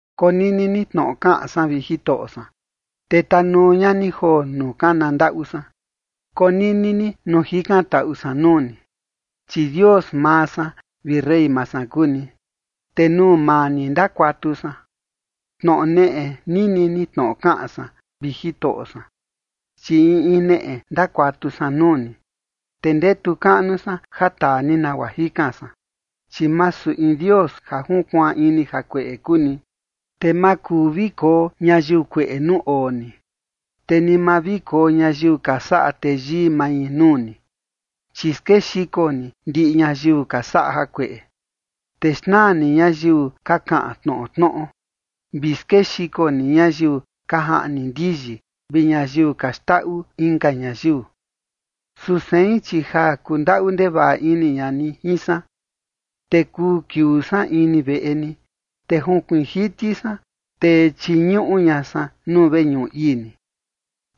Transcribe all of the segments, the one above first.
Konini ni tnoꞌo kaꞌan san, vi Jitoꞌo san, te tanuu ña ni joo nuu kana ndaꞌu san. Konini ni nuu jikantaꞌu san nuu ni, chi Dios maa san vi rey maa san kuu ni, te nuu maa ni ndakuatu san. Tnoꞌo neꞌe nini ni tnoꞌo kaꞌan san, vi Jitoꞌo san, chi in in neꞌe ndakuatu san nuu ni, te ndetu kaꞌnu san ja taa ni nagua jikan san. Chi masu in Dios ja junkuaan ini jakueꞌe kuu ni, te ma kuu vi koo ñayiu kueꞌe nuu oo ni. Te ni ma vi koo ñayiu ka saꞌa teyii mai nuu ni, chi skexiko ni ndiꞌi ñayiu ka saꞌa jakueꞌe. Te xnaa ni ñayiu ka kaꞌan tnoꞌo tnoꞌo, vi skexiko ni ñayiu ka jaꞌni ndiyi vi ñayiu ka xndaꞌu inka ñayiu. Su sein, chi ja kundaꞌu ndevaꞌa ini ña ni jin san, te kuu kiuu san ini veꞌe ni, te junkuiin jiti san, te chiñuꞌu ña san nuu veñuꞌu ii ni.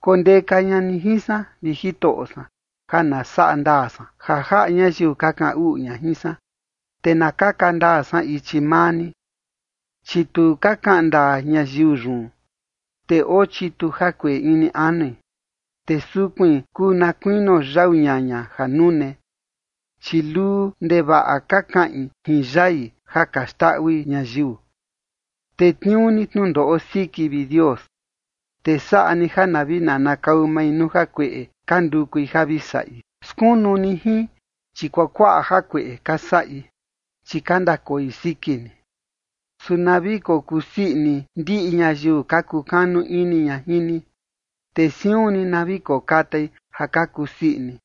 Kondeka ña ni jin san, vi Jitoꞌo san, ja na saꞌa ndaa san ja jaꞌa ñayiu ka kaꞌan uꞌu ña jin san, te na kaka ndaa san ichi maa ni. Chi tu ka kaꞌan ndaa ñayiu yun, te oo chitu jakueꞌe ini anui, te sukuin kuu na kuinio yau ñaña ja nune, chi luu ndevaꞌa ka kaꞌin jin yai ja ka xndaꞌui ñayiu. Tetniuu ni tnundoꞌo siki, vi Dios, te saꞌa ni ja na vi nanakau mai nuu jakueꞌe ka ndukui ja vi saꞌi. Skunu ni jin, chi kuakuaꞌa jakueꞌe ka saꞌi, chi ka ndakoi siki ni. Su na vi kokusii ini ndiꞌi ñayiu ka kukanu ini ña jin ni, te siun ni na vi kokatai ja ka kusii ini,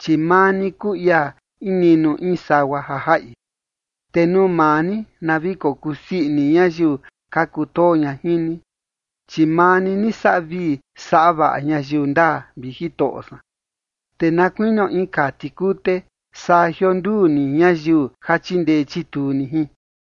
chi maa ni kuu ia in niꞌnu in sagua ja jaꞌi, te nuu maa ni na vi kokusii ini ñayiu ka kutoo ña jin ni. Chi maa ni saꞌa vii saꞌa vaꞌa ñayiu ndaa, vi Jitoꞌo san, te na kuinio in kaa tikute saa jionduu ni ñayiu ja chindee chituu ni jin.